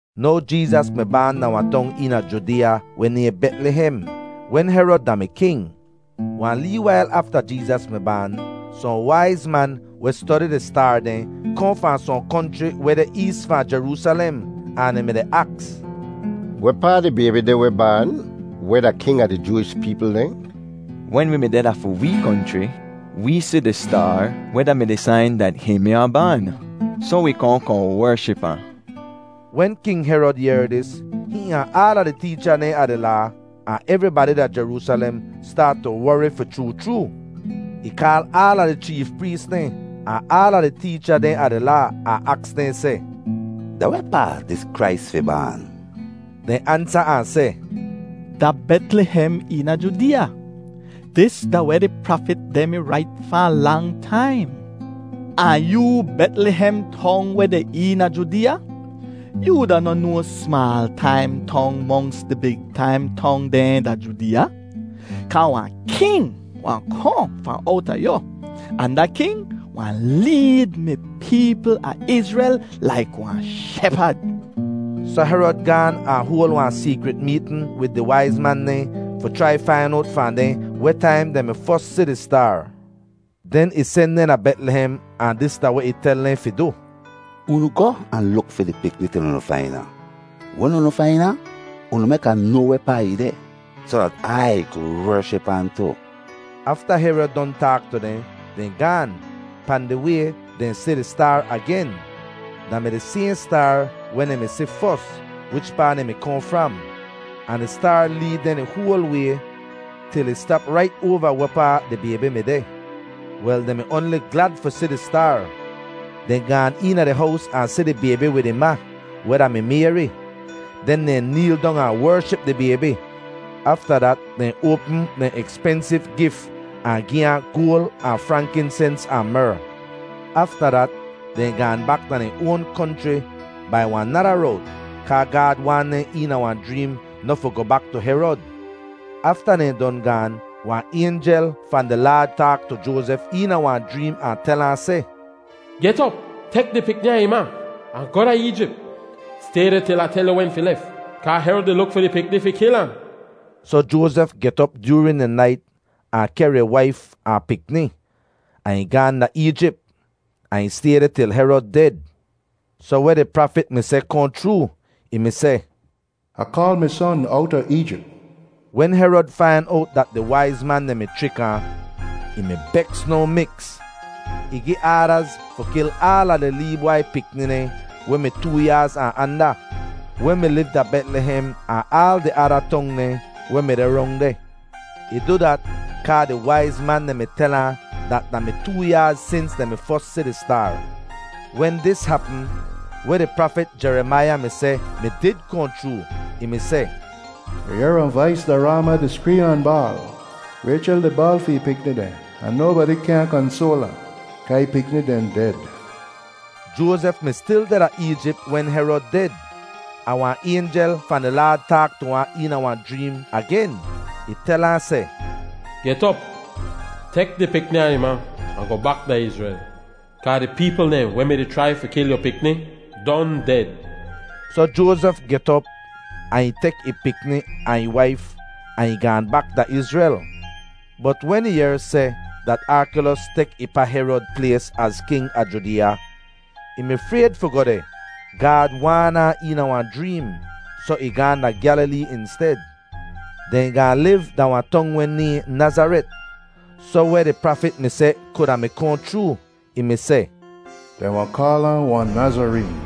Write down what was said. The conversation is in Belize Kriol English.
Now Jeezas mi baan da wahn tong eena Judeeya weh nayhn Betlihem wen Herod da-mi king. Wahn lee wail afta Jeezas mi baan, sohn waiz man weh stodi di staar dehn kohn fahn sohn konchri weh deh ees fahn Jeroosalem ahn dehn mi-di aks, “Wehpaa di baybi deh weh baan weh da king a di Jooish peepl dehn? Wen wi mi deh da fi wee konchri, wee si di staar weh da-mi di sain dat hihn mi wahn baan, soh wi kohn kohn wership ahn.” Wen King Herod yehr dis, hihn ahn aala di teecha dehn a di Laa ahn evribadi da Jeroosalem staat tu wori fi chroo chroo. Ih kaal aala di cheef prees dehn, ahn aala di teecha dehn a di Laa, ahn aks dehn seh, “Da wehpaa dis Krais fi baan?” Dehn ansa ahn seh, “Da Betlihem eena Judeeya. Dis da weh di prafit dehn mi rait fahn lang taim: ‘Ahn yoo Betlihem Tong weh deh eena Judeeya, yoo da noh no smaal taim tong monks di big taim tong dehn da Judeeya, kaa wahn king wahn kohn fahn owta yu ahn da king wahn leed mi peepl a Izrel laik wahn shepad.’” Soh Herod gaan ahn hoal wahn seekrit meetn wid di waiz man dehn fi chrai fain owt fahn dehn weh taim dehn mi fos si di staar. Den ih sen dehn da Betlihem ahn dis da weh ih tel dehn fi du: “Unu goh ahn luk fi di pikni til unu fain ahn. Wen unu fain ahn, unu mek Ah noa wehpaa ih deh, soh dat Ai ku wership ahn tu.” Afta Herod don taak tu dehn, dehn gaan. Pahn di way dehn si di staar agen; da mi di sayhn staar weh dehn mi si fos wichpaa dehn mi kohn fram. Ahn di staar leed dehn di hoal way til ih stap rait oava wehpaa di baybi mi deh. Wel, dehn mi oanli glad fi si di staar. Dehn gaan eena di hows ahn si di baybi wid ih ma, weh da-mi Mayri. Den dehn neel dong ahn wership di baybi. Afta dat dehn oapm dehn ekspensiv gif ahn gi ahn goal ahn frankinsens ahn mer. Afta dat dehn gaahn bak da dehn oan konchri bai wahn nada rowt, kaa Gaad waan dehn eena wahn jreem noh fi goh bak tu Herod. Afta dehn don gaan, wahn aynjel fahn di Laad taak tu Joazef eena wahn jreem ahn tel ahn seh, “Get op, tek di pikni ahn ih ma, ahn goh da Eejip. Stay deh til Ah tel yu wen fi lef, kaa Herod di luk fi di pikni fi kil ahn.” Soh Joazef get op joorin di nait ahn kehr ih waif ahn pikni, ahn ih gaahn da Eejip, ahn ih stay deh til Herod ded. Soh weh di prafit mi seh kohn chroo. Ih mi seh, “Ah kaal mi Son owta Eejip.” Wen Herod fain owt dat di waiz man dehn mi chrik ahn, ih mi beks no miks. Ih gi aadaz fi kil aala di lee bwai pikni dehn weh mi too yaaz ahn anda, weh mi liv da Betlihem ahn aal di ada tong dehn weh mi deh rong deh. Ih du dat kaa di waiz man dehn mi tel ahn dat da mi too yaaz sins dehn mi fos si di staar. Wen dis hapm, weh di prafit Jerimaiya mi seh mi did kohn chroo. Ih mi seh, “Yu yehr wahn vais da Raama di skreem ahn baal. Raychel di baal fi ih pikni dehn ahn nobadi kyaahn kansoal ahn, kaa ih pikni dehn ded.” Joazef mi stil deh da Eejip wen Herod ded. Ahn wahn aynjel fahn di Laad taak tu ahn eena wahn jreem agen. Ih tel ahn seh, “Get op, tek di pikni ahn ih ma ahn goh bak da Izrel, kaa di peepl dehn weh mi-di chrai fi kil yu pikni don ded.” Soh Joazef get op ahn ih tek ih pikni ahn ih waif ahn ih gaahn bak da Izrel. Bot wen ih yehr seh dat Arkelos tek ih pa Herod plays az king a Judeeya, ih mi frayd fi goh deh. Gaad waan ahn eena wahn jreem, soh ih gaahn da Gyalilee insted. Dehn gaahn liv da wahn tong weh nayhn Nazaret, soh weh di prafit mi seh kuda mi kohn chroo. Ih mi seh, “Dehn wahn kaal ahn wahn Nazareen.”